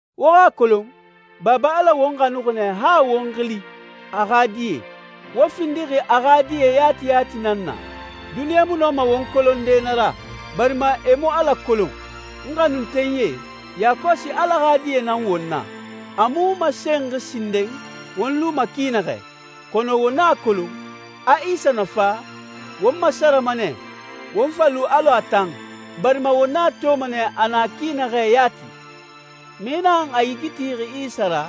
Wo xa a kolon, Baba Ala won xanuxi nɛ han a won xili «a xa die». Won findixi a xa die yati yati nan na. Duniɲa mu nɔma won kolonde na ra, barima e mu Ala kolon. N xanuntenyie, yakɔsi Ala xa die nan won na. A mu masenxi sinden won luma ki naxɛ, kɔnɔ won a kolon, a Isa na fa, won masarama nɛ, won fa lu alɔ a tan, barima won a toma nɛ a na ki naxɛ yati. Mixi naxan a yigi tixi Isa ra,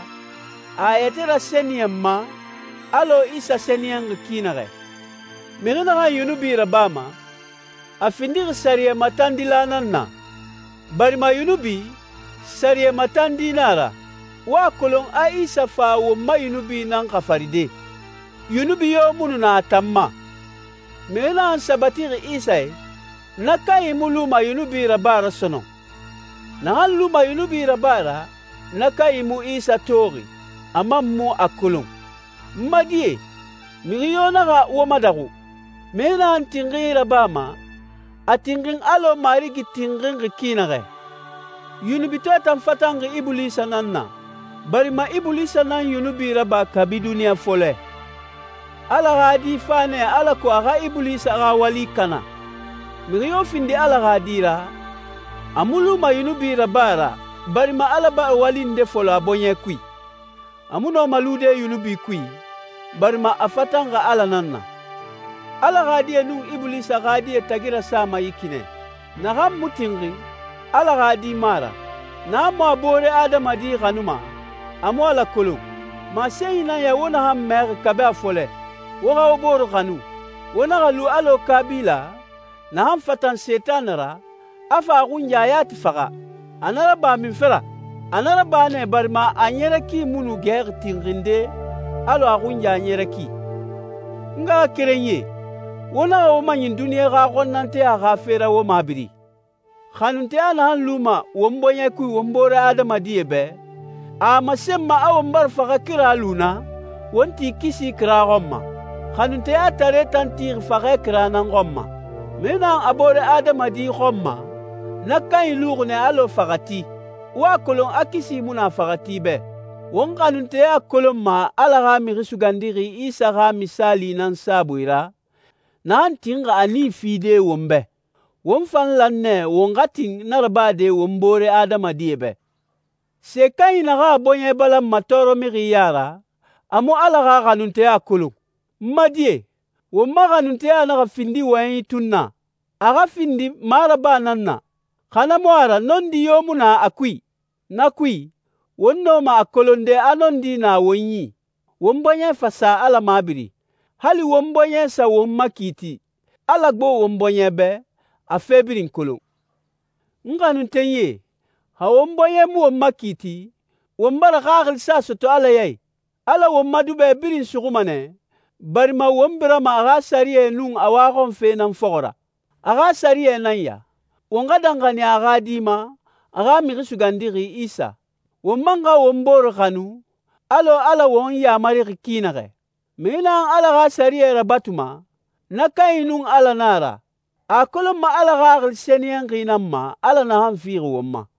a a yɛtɛ rasɛniyɛnma, alɔ Isa sɛniyɛnxi ki naxɛ. Mixi naxan yunubi rabama, a findixi sɛriyɛ matandila nan na, barima yunubi, sɛriyɛ matandi nan a ra. Wo a kolon a Isa fa won ma yunubi nan xafaride. Yunubi yo mu nu na a tan ma. Mixi naxan sabatixi Isa i, na kanyi mu luma yunubi raba ra sɔnɔn. Naxan luma yunubi raba ra, na kanyi mu Isa toxi, a man mu a kolon. N ma die, mixi yo naxa wo madaxu. Mixi naxan tinxinyi rabama, a tinxin alɔ Marigi tinxinxi ki naxɛ. Yunubitɔɛ tan fatanxi Ibulisa nan na, barima Ibulisa nan yunubi raba kabi duniɲa fɔlɛ. Ala xa Di fa nɛ alako a xa Ibulisa xa wali kana. Mixi yo findi Ala xa di ra, a mu luma yunubi raba ra, barima Ala bara wali nde fɔlɔ a bɔɲɛ kui. A mu nɔma lude yunubi kui, barima a fatanxi Ala nan na. Ala xa die nun Ibulisa xa die tagi rasama yi ki nɛ: Naxan mu tinxin, Ala xa di mu a ra. Naxan mu a boore adamadie xanuma, a mu Ala kolon. Masenyi nan ya wo naxan mɛxi kabi a fɔlɛ: Won xa won bore xanu. Won naxa lu alɔ Kabila, naxan fatan Sentanɛ ra, a fa a xunya yati faxa. A na raba munfe ra? A na raba nɛ barima a ɲɛrɛ ki mu nu gɛxi tinxinde alɔ a xunya ɲɛrɛ ki. N ngaxakerenyie, wo naxa wo maɲin duniɲa xa xɔnnanteya xa fe ra wo mabiri. Xanunteya naxan luma won bɔɲɛ kui won boore adamadie bɛ, a a masenma a won bara faxɛ kira lu na, won ti kisi kira xɔn ma. Xanunteyatare tan tixi faxɛ kira nan xɔn ma. Mixi naxan a boore adamadi xɔnma, na kanyi luxi nɛ alɔ faxɛti. Wo a kolon a kisi mu na faxɛti bɛ. Won xanunteya kolonma Ala xa Mixi Sugandixi Isa xa misaali nan saabui ra, naxan tinxi a nii fide won bɛ. Won fan lan nɛ won xa tin na rabade won boore adamadie bɛ. Se kanyi naxan a bɔɲɛ balanma tɔɔrɔmixi ya ra, a mu Ala xa xanunteya kolon. N ma die, won ma xanunteya naxa findi wɔyɛnyi tun na, a xa findi maraba nan na, xa na mu a ra nɔndi yo mu na a kui. Na kui, won nɔma a kolonde a nɔndi na won yi, won bɔɲɛ fa sa Ala mabiri. Hali won bɔɲɛ sa won makiiti, Ala gbo won bɔɲɛ bɛ, a fe birin kolon. N xanuntenyie, xa won bɔɲɛ mu won makiiti, won bara xaxilisa sɔtɔ Ala ya i. Ala won ma duba birin suxuma nɛ, barima won birama a xa sɛriyɛe nun a waxɔnfe nan fɔxɔ ra. A xa sɛriyɛ nan ya: Won xa danxaniya a xa Di ma, a xa Mixi Sugandixi Isa. Won man xa won bore xanu, alɔ Ala won yamarixi ki naxɛ. Mixi naxan Ala xa sɛriyɛ rabatuma, na kanyi nun Ala na a ra. A a kolonma Ala Xaxili Sɛniyɛnxi nan ma, Ala naxan fixi won ma.